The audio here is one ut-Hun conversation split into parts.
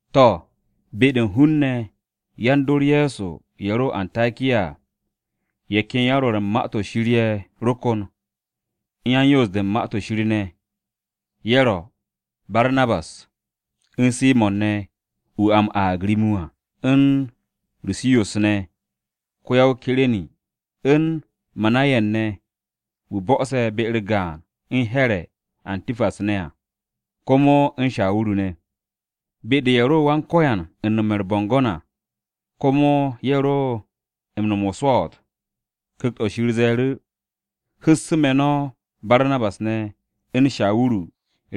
To̱, be-de u̱n hun-ne̱ yan-dor Ye̱so ye̱ ro o-Antakiya à, ye̱ ken yan-Rwo̱r u̱n Ma-to̱ Shir ye̱ ro kon u̱n yan-Yoos-de u̱n Ma-to̱ Shir ne̱. Ye̱ ro: Barnabas, u̱n Simo̱n ne̱ (wu̱ a m-aag Rim-wu̱ à), u̱n Rushiyos ne̱ (ko-ya-o-Kire̱ni), u̱n Manayen ne̱ (wu̱ bo̱'o̱se̱ be-u̱r gaan u̱n Here̱ [Atipas] ne̱ à), komo u̱n Shawuru ne̱. Da-de ye̱ ro Wan-Ko̱yan u̱n nome̱ u̱r-bo̱ngo̱n à, komo ye̱ ro u̱n nom o-swo̱o̱t. Ku̱kt-o̱ Shir ze̱e̱ru̱, “Hu̱ssu̱ me̱ no̱ Barnabas ne̱, u̱n Shawuru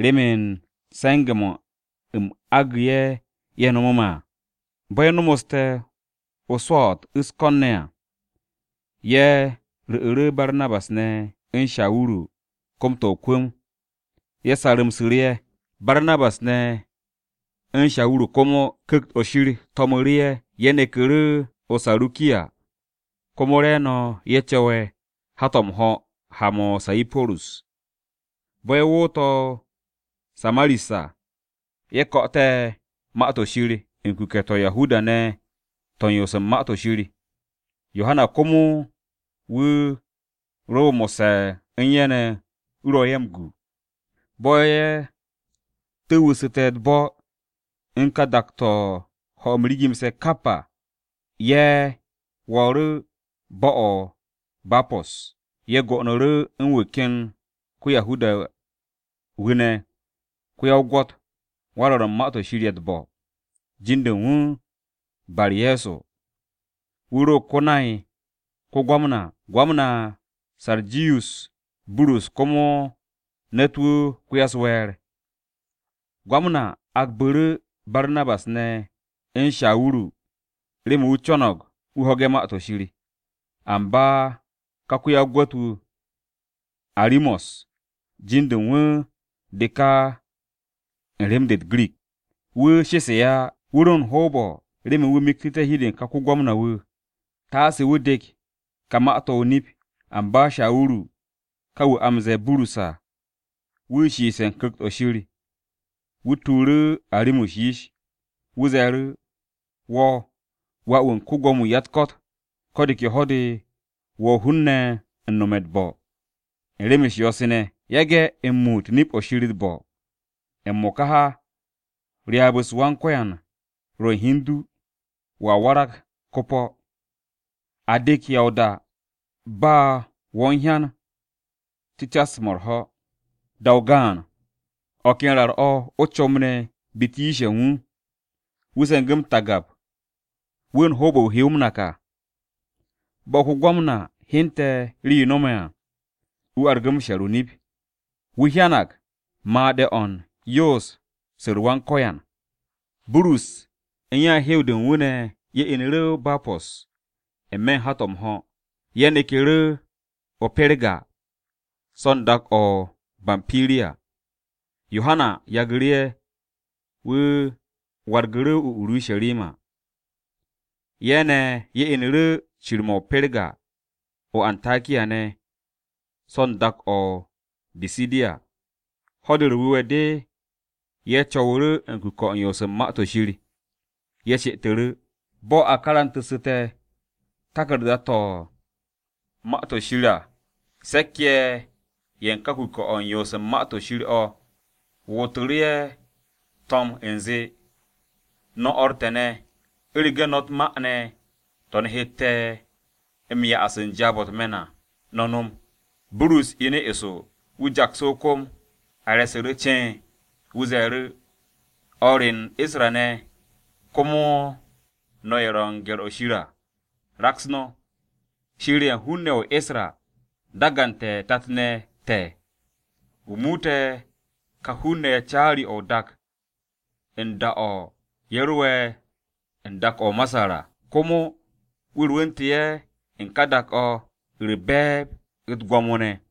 remen se̱nge̱-mo̱ u̱m agu̱ ye̱ ye̱ nom à.” Bo̱ ye̱ nomoste̱ o-swo̱o̱t u̱s-ko̱n ne̱ à, ye̱ ru̱'u̱ru̱ Barnabas ne̱, u̱n Shawuru kom-to̱ o-kwu̱m, ye̱ sarru̱msu̱ ye̱. Barnabas ne̱, u̱n Shawuru komo, Ku̱kt-o̱ Shir to̱mu̱ru̱ ye̱. Ye̱ neku̱ru̱ o-Sarukiya, komo re̱e̱no̱ ye̱ co̱we̱ hat-o̱ m-ho̱ ha-mo̱ o-Sayipurus. Bo̱ ye̱ wo̱o̱te̱ o-Saramis à, ye̱ ko̱'o̱te̱ Ma-to̱ Shir u̱n kuke̱-to̱ Yahuda-ne̱ to̱ u̱n yoos u̱n Ma-to̱ Shir. Yohana komo wu̱ ro mo̱sse̱ u̱n ye̱ ne̱, wu̱ ro ye̱ m-gu. Bo̱ ye̱ tu̱wu̱su̱te̱ u̱t-bo̱ u̱n ka dak-o̱ ho̱-m rigimse̱ kap à, ye̱ wo̱o̱ru̱ bo̱-o̱ o-Bapo̱s. Ye̱ go'onu̱ru̱ u̱n wu̱ ken ko-Yahuda-wu̱ ne̱ ko-ya-o-gwo̱t, wan-rwo̱r u̱n ma-to̱ shir ye̱ u̱t-bo̱, jin-de u̱n wu̱ Bar-Ye̱so. Wu̱ ro ko-nay ko-Gwamna Sarjiyus Burus. Gwamna Sarjiyus Burus komo ne̱t-wu̱ ko-ya-u̱s-we̱e̱r. Ko-Gwamna agbu̱ru̱ Barnabas ne̱, u̱n Shawuru remen wu̱ co̱no̱g wu̱ ho̱ge̱ Ma-to̱ Shir. Amba ka ko-ya-o-gwo̱t-wu̱ Arimos (jin-de u̱n wu̱ de ka u̱n rem-de u̱t-Girik), wu̱ shesu̱ ye̱ á, wu̱ ro u̱n o-hoob wu̱ miktu̱té̱ hi-de u̱n ka ko-Gwamna-wu̱ taase wu̱ dek ká ma-to̱ o-nip. Amba Shawuru, ka wu̱ a m-ze̱e̱ Burus à, wu̱ shiiste̱ u̱n Ku̱kt-o̱ Shir, wu̱ tuuru̱ Arimos yish. Wu̱ ze̱e̱ru̱, “Wo̱ wà-wu̱ u̱n ko-Gwo̱mo-wu̱ u̱n ya-u̱t-ko̱t! Ko̱ de ke ho̱-de wo̱ hun-ne̱ u̱n nome̱ u̱t-bo̱, u̱n rem-u̱s yo̱-se ne̱. Yage̱ m-muut nip-o̱ Wan-Ko̱yan u̱t-bo̱. M-mo̱ka ha, ryaab-se u̱n Wan-Ko̱yan ro̱ u̱n hi u̱n du, wo̱a warag ko-po̱. A dek ya o-da, ba wo̱ u̱n hyan cu̱cas-mo̱ u̱r-ho̱.” Da-o gaan, o̱ ken rar-o̱ o-comb ne̱ biti yish-ye̱ u̱n wu̱. Wu̱ se̱ngu̱ u̱t-tagab wu̱ u̱n hoob-o̱ u̱n wu̱ he wu̱ m-nak à. Bo̱ ko-Gwamna hyente̱ rii-yo no̱me̱ à, wu̱ argu̱ m-she̱r o-nip. Wu̱ hyanag made̱-o̱ u̱n yoos-u̱r Wan-Ko̱yan. Burus u̱n ya-u̱r-hew de u̱n wu̱ ne̱ ye̱ inu̱ru̱ o-Bapo̱s n-me̱ u̱n hat-o̱ m-ho̱. Ye̱ neku̱ru̱ o-Perga so̱ u̱n dak-o̱ o-Bampiriya. Yohana yagu̱ru̱ ye̱, wu̱ wargu̱ru̱ o-Urusharima. Ye̱ ne̱ ye̱ inu̱ru̱ cir-mo̱ o-Perga o-Antakiya ne̱ so̱ u̱n dak-o̱ o-Bisidiya. Ho̱-de u̱r-Wu̱we̱ de, ye̱ co̱wu̱ru̱ u̱n kuke̱-o̱ u̱n yoos u̱n Ma-to̱ Shir, ye̱ she'etu̱ru̱. Bo̱ a karante̱ taku̱rda-to̱ u̱n Ma-to̱ Shir à, se̱k-ye̱ ye̱ u̱n ká kuke̱-o̱ u̱n yoos u̱n Ma-to̱ Shir o̱ wootu̱ru̱ ye̱ to̱m u̱nze, “No̱ o̱r te̱ ne̱, u̱rege̱ no̱ u̱t-ma ne̱ to̱ no̱ hette̱ te̱ do ye̱ u̱n jaab-o̱ u̱t-me̱n à, no̱ nom.” Burus inu̱ eso, wu̱ jaksu̱ o-kom a re̱su̱ru̱ ce̱e̱n. Wu̱ ze̱e̱ru̱, “No̱ o̱r re u̱n Isra-ne̱, komo no̱ ye̱ ro̱ u̱n ‘Wan-se̱ps u̱n Shir,’ raks no̱! Shir ye̱ u̱n hun-ne̱ o-Isra dagante̱ tat-ne̱ te̱, wu̱ muute̱ ka hun-ne̱ ye̱ caari-o̱ o-dak u̱n da-o̱ ye̱ ro'e̱ u̱n dak-o̱ o-Masar à. Komo wu̱ rwu̱ntu̱ ye̱ u̱n ka dak-o̱ u̱r-be̱e̱b u̱t-gwo̱mo ne̱.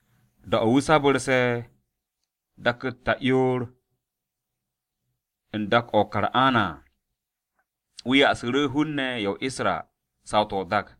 Da-o̱ wu̱ sabarse̱ dak-u̱t ta'yoor u̱n dak-o̱ o-Kan'ana à, wu̱ ya'asu̱ru̱ hun-ne̱ ye̱ o-Isra saw-to̱ o-dak.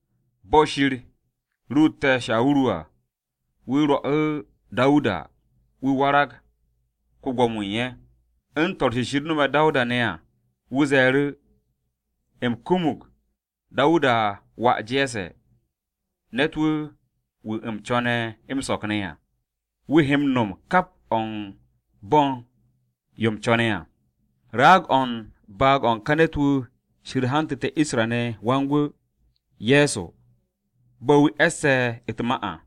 Bo̱ Shir ruute̱ Shawuru à, wu̱ rwo̱'u̱ Dawuda wu̱ warag ko-Gwo̱mo-wu̱ u̱n ye̱. U̱n to̱r-se Shir no̱me̱ Dawuda ne̱ à, wu̱ ze̱e̱ru̱, ‘U̱m kumug Dawuda wà Je̱sse̱, ne̱t-wu̱, wu̱ u̱m co̱ne̱ m-so̱k ne̱ à. Wu̱ he m-no̱m kap o̱ u̱n bo̱ u̱n yo u̱m co̱ne̱ à.’ “Raag-o̱ u̱n baag-o̱ u̱n ka ne̱t-wu̱ Shir hantu̱te̱ Isra-ne̱ Wan-Gwu̱, Ye̱so, bo̱ wu̱ e̱sse̱ u̱t-ma à.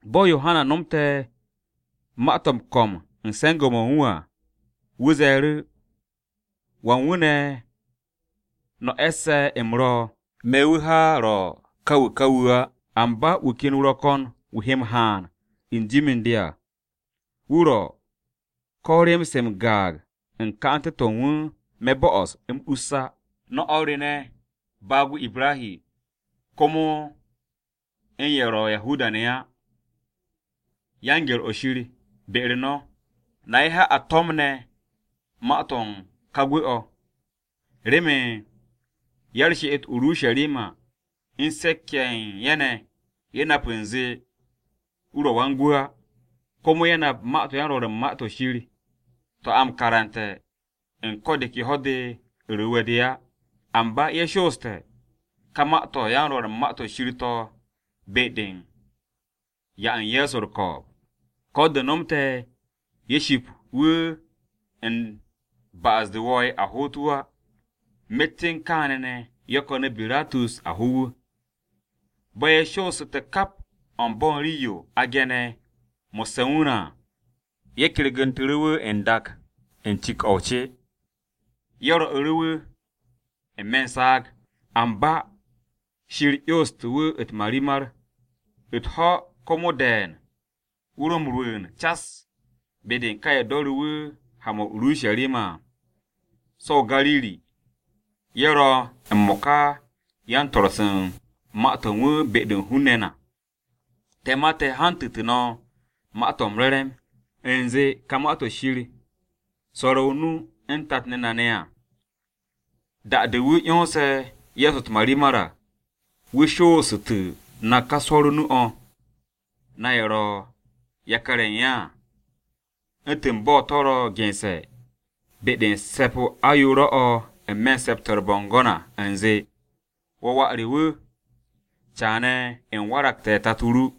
Bo̱ Yohana nomte̱ ma-to̱ m-ko̱m u̱n se̱nge̱-mo̱ u̱n wu̱ à, wu̱ ze̱e̱ru̱, ‘¿Wan wu̱ ne̱ no̱ e̱sse̱ u̱m ro̱? Me̱ wu̱ ha ro̱ ka wu̱ ka wu̱ á. Amba wu̱ ken wu̱ ro̱ ko̱n wu̱ he m-haan u̱n jim u̱n de à, wu̱ ro̱ ko̱ rii-se m-gaag u̱n ka'ante̱-to̱ u̱n wu̱ me̱ bo'os m-us á.’ “No̱ o̱r re ne̱, baag-o Ibrahi, komo u̱n ye̱ ro̱ Yahuda-ne̱ á ‘Wan-se̱ps u̱n Shir’ be u̱n no̱, na ye̱ ha a to̱mne̱ ma-to̱ u̱n ka gwu̱-o̱. Remen ya-u̱r-she'et o-Urusharima u̱n se̱k-ye̱ ye̱ u̱n ye̱ ne̱, ye̱ nap u̱nze wu̱ ro̱ Wan-Gwu̱ á. Komo ye̱ nap ma-to̱ u̱n yan-Rwo̱r u̱n Ma-to̱ Shir to̱ a m-karante̱ u̱n ko̱ de ke Ho̱-de u̱r-Wu̱we̱ de á. Amba ye̱ shooste̱ ka ma-to̱ yan-Rwo̱r u̱n Ma-to̱ Shir to̱ be-de u̱n 'ya u̱n Ye̱so u̱r-ko̱o̱b. Ko̱ de̱ nomte̱ ye̱ ship wu̱ u̱n ba'as-de wo̱o̱'e̱ a hoot wu̱ á, myet u̱n kaane̱ ne̱ ye̱ ko̱nu̱ Biratus a ho wu̱. Bo̱ ye̱ shoossu̱te̱ kap o̱ u̱n bo̱ u̱n rii-yo a ge̱ne̱ mo̱sse̱ u̱n wu̱ ne̱ à, ye̱ kergu̱ntu̱ru̱ wu̱ n-dak u̱n cik-o o-ce, ye̱ rwo̱'u̱ wu̱ n-me̱ u̱n saag. Amba Shir 'yonstu̱ wu̱ u̱t-marimar. U̱t-ho̱ komo de̱e̱n wu̱ ro m-rwu̱u̱n cas be-de u̱n ka ye̱ do̱ru̱ wu̱ ha-mo̱ o-Urusharima à, so̱ o-Gariri. Ye̱ ro̱ m-mo̱ka yan-swo̱-se u̱n ma-to̱ u̱n wu̱ be-de u̱n hun-ne̱ na. “Te̱ ma te̱ hantu̱tu̱ no̱ Ma-to̱ m-Re̱re̱m, u̱nze ka Ma-to̱ Shir swo̱re̱ o-nu u̱n tat-ne̱ na ne̱ à. Da-de wu̱ 'yonse̱ Ye̱so u̱t-marimar à, wu̱ shoosu̱tu̱ na ká swo̱r o-nu o̱, na ye̱ ro̱ yakar-ye̱ u̱n ye̱ à. U̱ntu̱n bo̱ to̱ ro̱ gense̱ be-de u̱n se̱p-o ayoore̱-o̱ n-me̱ Se̱p-to̱ u̱r-Bo̱ngo̱n à u̱nze, “ ‘Wo̱ Wà re wu̱, Caane̱ u̱m waragte̱ Tato ru.’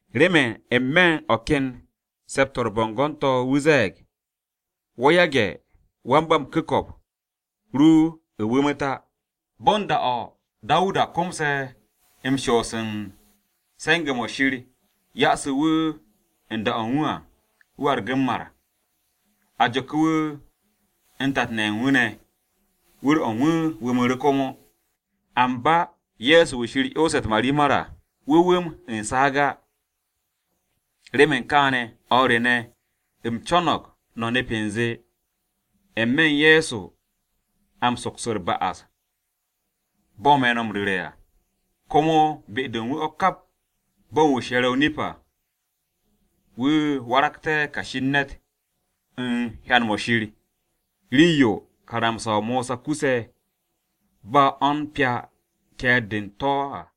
Remen n-me̱ u̱n o̱ ken Se̱p-to̱ u̱r-Bo̱ngo̱n to̱ wu̱ ze̱e̱g, ‘Wo̱ yage̱ Wan-ba-m-ku̱ko̱p ru wu̱mu̱t á.’ “Bo̱ u̱n da-o̱ Dawuda komse̱ m-shoos u̱n se̱nge̱-mo̱ Shir ya'asu̱ wu̱ u̱n da-o̱ u̱n wu̱ à, wu̱ argu̱ m-mar. A jo̱ku̱ wu̱ u̱n tat-ne̱ ye̱ u̱n wu̱ ne̱, wu̱r-o̱ u̱n wu̱ wu̱mu̱ru̱ komo. Amba Ye̱so wu̱ Shir 'yonse̱ u̱t-marimar à wu̱ wu̱m u̱n saag á. “Remen kaane̱, o̱r re ne̱, u̱m co̱no̱g no̱ nep u̱nze n-me̱ Ye̱so o̱ a m-soks u̱r-ba'as bo̱ me̱ no̱ m-ru̱re̱ à. Komo be-de u̱n wu̱ o̱ kap bo̱ u̱n wu̱ she̱re̱ o-nip à, wu̱ waragte̱ kashi u̱n ne̱t u̱n hyan-mo̱ Shir, rii-yo karamsa-o Mosa kuse̱ ba o̱ u̱n pya ke̱e̱r-de u̱n to̱ à.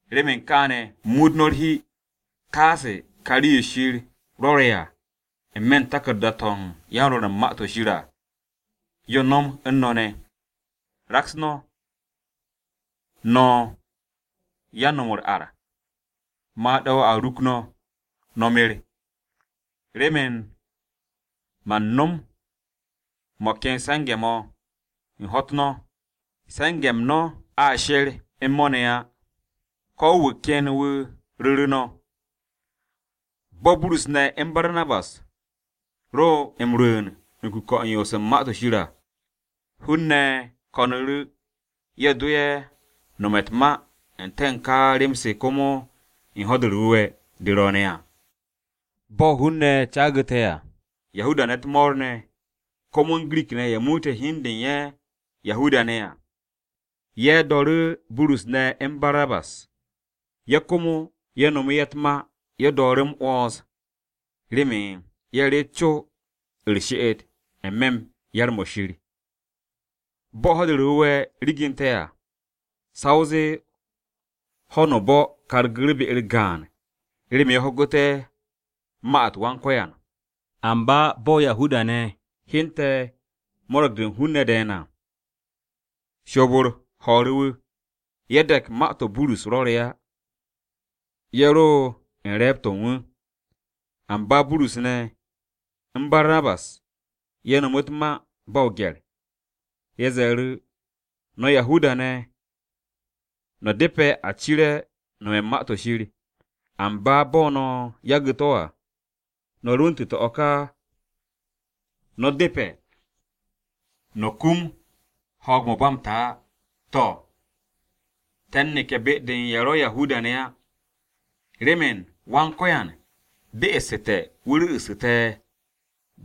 Remen kaane̱ muut no̱ u̱r-hi, taase ka rii-yo Shir rwo̱re̱ nu à, n-me̱ u̱n taku̱rda-to̱ u̱n yan-Rwo̱r u̱n Ma-to̱ Shir à, yo nom u̱n no̱ ne̱: “ ‘Raks no̱, no̱ yan-no̱m u̱r-ar, made̱-o a ruk no̱, no̱ mer! Remen man nom mo̱ ken se̱nge̱-mo̱, u̱n ho̱-u̱t no̱, se̱nge̱-m no̱ a she̱r u̱n mo̱ ne̱ á, ko̱ wu̱ ken wu̱ ru̱ru̱ no̱!’” Bo̱ Burus ne̱, u̱n Barnabas ro m-rwu̱u̱n u̱n kuke̱-o̱ u̱n yoos u̱n Ma-to̱ Shir à, hun-ne̱ ko̱nu̱ru̱, ye̱ do ye̱ nome̱ u̱t-ma n-te̱ u̱n ka rem-se komo u̱n Ho̱-de u̱r-Wu̱we̱ de ro̱o̱ne̱ à. Bo̱ hun-ne̱ caagu̱te̱ à, Yahuda-ne̱ u̱t-mo̱o̱r ne̱, komo u̱n Girik-ne̱ ye̱ muute̱ hi u̱n de u̱n ye̱ Yahuda-ne̱ à, u̱n ye̱ do̱ru̱ Burus ne̱, u̱n Barnabas. Ye̱ komo ye̱ nome̱ ye̱ u̱t-ma ye̱ do̱o̱ru̱ m-'wo̱ns remen ye̱ reet co u̱r-she'et n-me̱ u̱n yar-mo̱ Shir. Bo̱ Ho̱-de u̱r-Wu̱we̱ riginte̱ à, sa o zee ho̱no o-bo̱ kargu̱ru̱ be-u̱r gaan remen ye̱ ho̱gu̱té̱ Ma-u̱t Wan-Ko̱yan. Amba bo̱ Yahuda-ne̱ hyente̱ mo̱ro̱g-de u̱n hun-ne̱ de̱e̱n à, shoob-u̱r ho̱o̱ru̱ ye̱. Ye̱ de̱k ma-to̱ Burus rwo̱re̱ á, ye̱ ro u̱n re̱e̱b-to̱ u̱n wu̱. Amba Burus ne̱, u̱n Barnabas ye̱ no̱mu̱ u̱t-ma ba o-gye̱r. Ye̱ ze̱e̱ru̱. “No̱ Yahuda-ne̱ no̱ depe̱ a cire̱ no̱me̱ u̱n Ma-to̱ Shir. Amba bo̱ no̱ yagu̱ to̱ à, no̱ rwu̱ntu̱te̱ o̱ ka no̱ depe̱ no̱ kum ho̱o̱g-mo̱ ba m-ta á. To̱, te̱ u̱n neke̱ be-de u̱n ye̱ ro̱ Yahuda-ne̱ á. Remen Wan-Ko̱yan be'esu̱te̱ wu̱ ru̱'u̱ste̱ te̱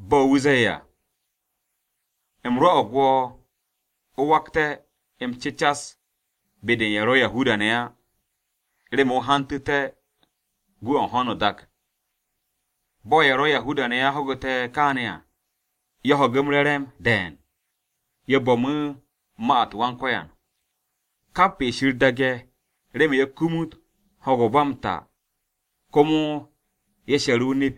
bo̱ wu̱ ze̱e̱ à, “ ‘U̱m rwo̱'o̱g wo̱ o wakte̱ m-cecas be-de u̱n ye̱ ro̱ Yahuda-ne̱ á. Remen o hantu̱te̱ gwu̱ o̱ u̱n ho̱no o-dak.’” Bo̱ ye̱ ro̱ Yahuda-ne̱ á ho̱gu̱te̱ kaane̱ à, ye̱ ho̱gu̱ m-re̱re̱m de̱e̱n. Ye̱ bo̱mu̱ ma-u̱t Wan-Ko̱yan. Kap ye̱ Shir daage̱ remen ye̱ kumut ho̱o̱g-mo̱ ba m-ta komo ye̱ she̱ru̱ o-nip.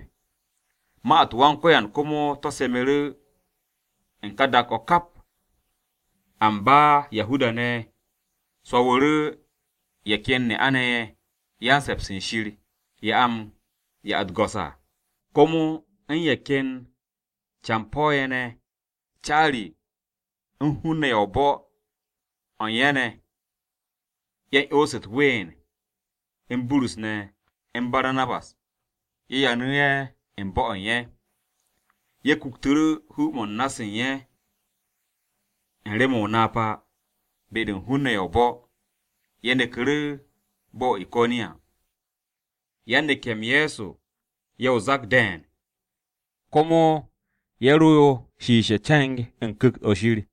Ma-u̱t Wan-Ko̱yan komo to̱ semu̱ru̱ u̱n ka dak-o̱ kap. Amba Yahuda-ne̱ swo̱wu̱ru̱ ye̱ ken ne'a-ne̱ ye̱ “Yan-se̱ps u̱n Shir,” ye̱ a m-'ya u̱t-go̱s à, komo u̱n ye̱ ken campo̱-ne̱ ye̱ ne̱ u̱n caari-ye̱ u̱n hun-ne̱ ne̱ ye̱ u̱n bo̱-o̱ u̱n ye̱ ne̱. Ye̱ 'yonsu̱ u̱t-ween u̱n Burus ne̱, u̱n Barnabas, ye̱ yanu̱ ye̱ u̱n bo̱-o̱ u̱n ye̱. Ye̱ kuktu̱ru̱ hu-mo̱ u̱n na-se u̱n ye̱ u̱n rem o-napa be-de u̱n hun-ne̱ ye̱ o-bo̱, ye̱ neku̱ru̱ bo̱-o̱ o-Iko̱niya. Yan-neke̱-m Ye̱so ye̱ o-zak de̱e̱n, komo ye̱ ro shiishe̱ ce̱ng u̱n Ku̱kt-o̱ Shir.